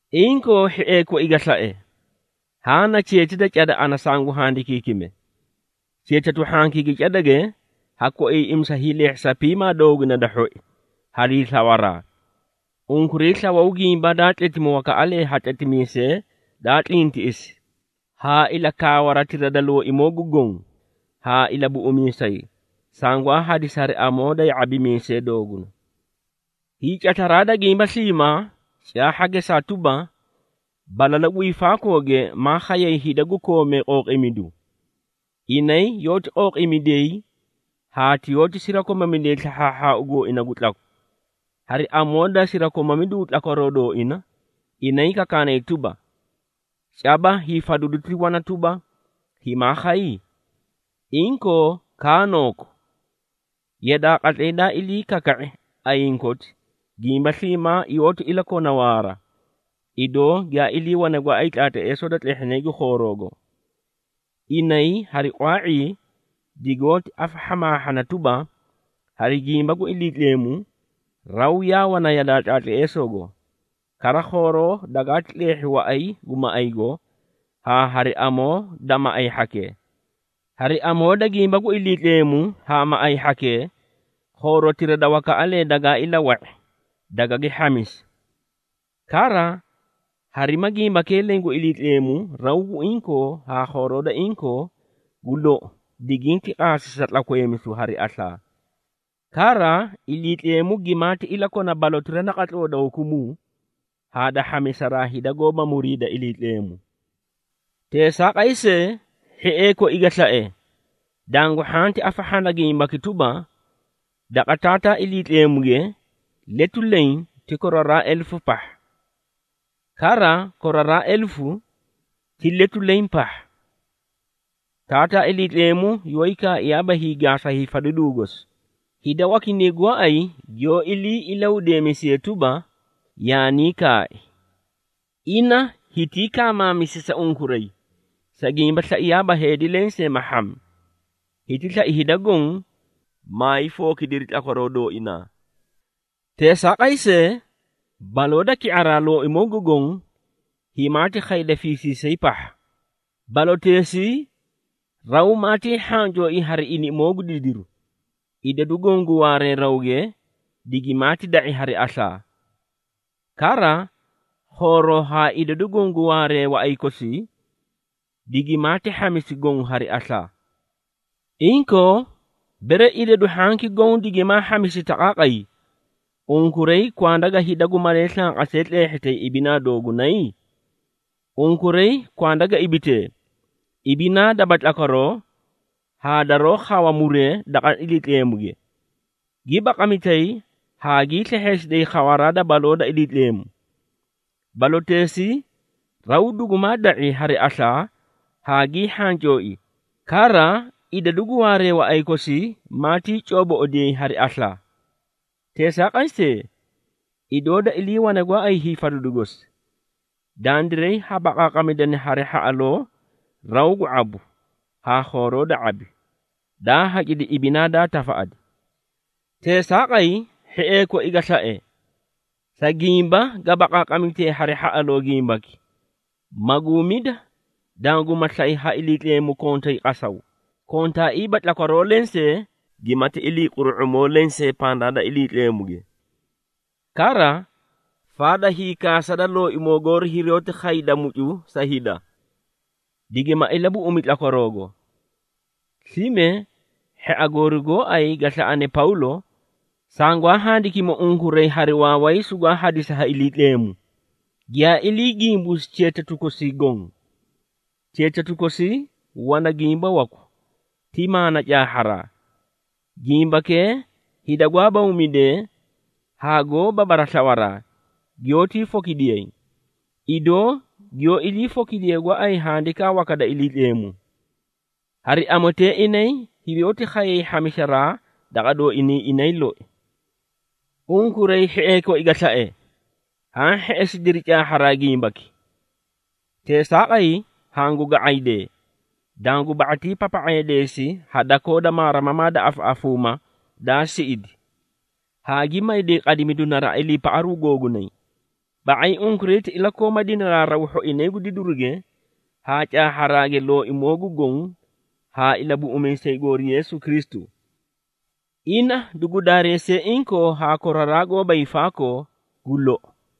Inkoo, hhiee koi ga slae, haã na cheeti da cada ana sangu handikiikime. Cheetatu hhankii gu cadage ha koiiꞌimisa hiileehhisa piimaa dooguna da hhoi, harii slawaraa. Unkuray slawaw gimba daa tletimi wakaꞌalee ha tletimiisee daa tlintiꞌisi, haa ilakaawatira da Looimoo gu Goõ haa Ilabuꞌumiisay, sangwaa hadisi hari amoo da ya⁄abimiisee dooguna. Hiicataraa da gimba sliimaa caahha gesaa tuba, balalu gu hiifaakooge maa khayay hida gu koomee qooqiimidu. Inay yoóti qooqiimidiyay haa yoóti sirakomamidiyay slahhaahhaau gooina gu tlaku. Hari amoo da sirakomamidu tlakwaroo dooina, inay kakaanay tuba, “Caba hiifadidu ti wana tuba, himaa khay? Inkoo, kaanoku? Yadaa qatlay daa ilii kaka⁄i ayiĩ koti, gimba sliimaa yoóti ilakona waara, idoo giyaa iliiwane gooay tlaatleesoo da tlehhinay gu khooroogo.” Inay hari qwaa⁄ii digoóti afahhamaahhana tuba, hari gimba gu Iliitleemu raw yaa wana yadaa tlaatleesoogo, kara khooroo dagaati tleehhi waꞌay gu maꞌaygo haa hari amoo da maꞌay hhakee. Hari amoo da gimba gu Iliitleemu haa maꞌay hhakee, khoorotira da wakaꞌalee dagaa ilawa⁄i, dagagi hhamisi. Kara, harima gimbakee leẽ gu Iliitleemu raw gu inkoo haa khooroo da inkoo, gu lou diginti qaasi sa tlakweemisu hari aslaa. Kara, Iliitleemu gimaati iliikona balotira naqatloo da hukumuu, haa da hhamisaraa hida goóba muriida Iliitleemu. Teesaaqay see, hhiee koi ga slae, dangu hhanti afahhana gimbaki tuba, daqa Taataa Iliitleemuge letu leẽ ti koraraa elefu pahha, kara koraraa elefu ti letu leẽ pahha. Taataa Iliitleemu yoóyi kaaiyaaba hiigaasa hiifadiduu gosi, hida wakinay gooay giyoó ilii ilahudeemisiyee tuba, yaanii kaai. Ina hitii kaamaamisi sa unkuray, sa gimba slaiyaaba heedi lensee ma hhami, hiti slai hida goõ, maay fookidiri tlakwaroo dooinaa. Teesaaqay see, baloo da ki⁄araa Looimoo gu Goõ, himaati khayda fiisiisay pahha. Baloteesii raw maatii hhancooi hari iniꞌimoo gu didiru. Idadu goõ gu waaree rawge, digimaati da⁄i hari aslaa. Kara, khooroo haa idadu goõ gu waaree waꞌay kosii, digimaati hhamisi goõ hari aslaa. Inkoo, bere idadu hhanki goõ digimaa hhamisi taqaaqay, unkuray kwanda ga hida gu malee slanqasee tleehhitay ibinaa doogunay? Unkuray kwanda ga ibitee, ibinaa daba tlakwaroo haa daroó khawa muree daqa Iliitleemuge, gi baqamitayi haa gii slehheesiday khawaraa da baloo da Iliitleemu. Baloteesii raw dugumaa da⁄i hari aslaa haa gii hhancooi, kara idadu gu waaree waꞌay kosii maatii cooboꞌodiyay hari aslaa. Teesaaqay see, idoo da iliiwane gooay hiifadidu gosi, dandiray ha baqaaqamidana hari hhaꞌaloo raw gu ⁄abu haa khooroo da ⁄abi, daa hacidi ibinaa daa tafaꞌadi. Teesaaqay, hhiee koi ga slae, sa gimba ga baqaaqamitee hari hhaꞌaloo gimbaki, maguumida, danguma slay ha Iliitleemu kontay qasaw, kontaaiiba tlakwaroo lensee gimati iliiquru⁄umoo lensee pandaa da Iliitleemuge. Kara, faada hiikaasa da Looimoo goori hiroóti khayda mucu sa hida, digima ilabuꞌumi tlakwaroogo. Slime hhia goori gooay ga slaꞌane Pawlo, sangwaa handikimi unkuray hari waaway sugwaa hadisi ha Iliitleemu, giyaa ilii gimbuusi cheetatu kosii goõ. Cheetatu kosii wana gimba waku ti maana caahharaa. Gimbakee hida gwaa bawmidee haa goóba baraslawaraa, giyoótii fokidiyay, idoo giyoó iliifokidiyee gooay Handikaa waka da Iliitleemu. Hari amotee inay hirooti khayay hhamisaraa daqa dooinay inay loi. Unkuray hhiee koi ga slae, haã hheꞌesidiri caahharaa gimbaki. Teesaaqay, hangu ga⁄aydee, dangu ba⁄ati papa⁄eedeesi ha dakoo da maarimamaa da afaꞌafuuma daa siꞌidi, haa gi mayday qadimidu naraꞌa iliipaꞌaru googunay. Ba⁄ay, unkuray ti ilakooma dinaraaraw hhoinay gu didiruge, haa caahharaage Looimoo gu Goõ haa Ilabuꞌumiisay goori Yeesu Kristu. Ina dugu daareesiye inkoo haa koraraa goóba hiifaakoo! Gu lou.